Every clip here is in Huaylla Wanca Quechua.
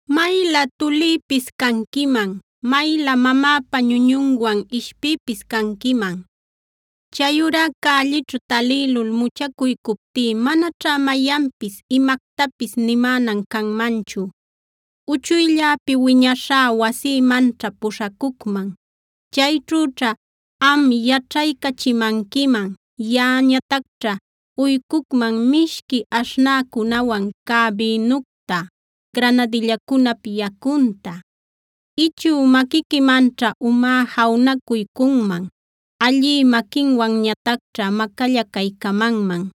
Maylä tulïpis canquiman; mayla mamäpa ñuñunwan ishpïpis canquiman. Chayurá cällićhu talïlul muchacuycuptí, manaćhá mayanpis imactapis nimänan canmanchu. Uchuylläpi wiñashá wasïmanćha puśhacucman; chayćhüćha am yaćhaycachimanquiman. Yaꞌañatacćha uycucman mishqui aśhnäcunawan cä bïnucta, granadillacunap yacunta. Ichü maquiquimanćha umá jawnacuycunman; allï maquinwanñatacćha macallacaycamanman.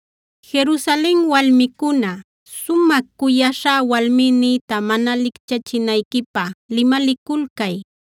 Jerusalen walmicuna, sumä cuyaśhá walmïnïta mana licchachinayquipä limaliculcay.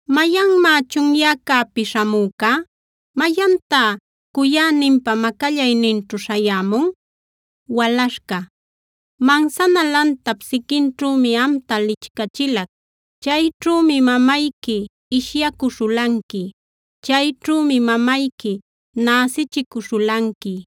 ¿Mayanmá chunyäcäpi śhamüca? ¿Mayantá cuyäninpa macallayninćhu śhayämun? Walaśhca Mansana lantap siquinćhümi amta lichcachilac. Chayćhümi mamayqui ishyacuśhulanqui; chayćhümi mamayqui näsichicuśhulanqui.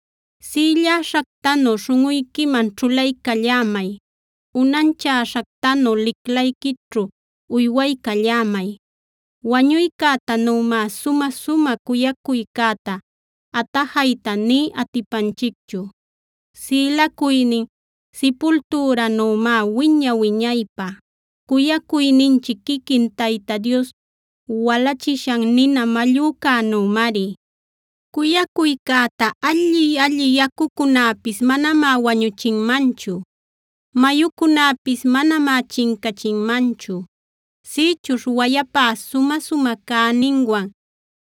Sïlläśhactanu śhunꞌuyquiman ćhulaycallämay; unanchäśhactanu liclayquićhu uywaycallämay. Wañuycätanümá sumä-sumä cuyacuycäta atajayta nï atipanchicchu; sïlacuynin sipultüränümá wiña-wiñaypä. Cuyacuyninchic quiquin Tayta Dios walachishan nina mallücänümari. Cuyacuycäta alli-alli yacucunäpis manamá wañuchinmanchu; mayucunäpis manamá chincachinmanchu. Sïchuśh wayapá sumä-sumä cäninwan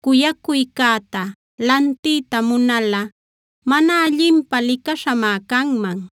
cuyacuycäta lantiyta munalꞌa mana allinpä licaśhamá canman.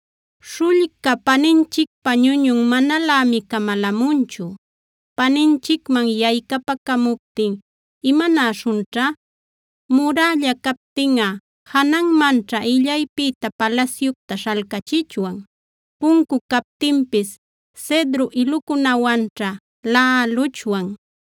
Śhullca paninchicpa ñuñun manalämi camalamunchu. Paninchicman yaycapacamuptin, ¿imanäśhunćha? Murälla captinꞌa jananmanćha illaypïta palasyucta śhalcächichwan. Puncu captinpis cedro ilucunawanćha laꞌaluchwan.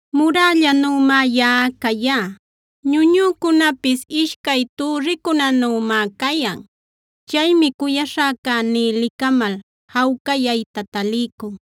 Murällanümá yaꞌa cayá; ñuñücunapis ishcay türricunanümá cayan. Chaymi cuyaśhäcäní licamal jawcayayta taliycun.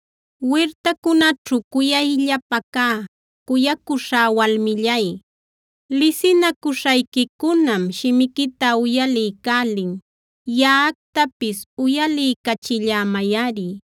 Wirtacunaćhu cuyayllapa cä cuyacuśhá walmillay, lisinacuśhayquicunam shimiquita uyaliycälin; yaꞌactapis uyaliycachillämayꞌari.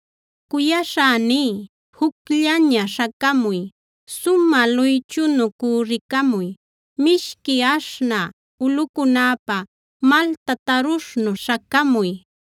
Cuyaśhäní jucllaña śhacamuy. Sumä luychunu cürricamuy, mishqui aśhnä ulꞌucunapa malta tarushnu śhacamuy.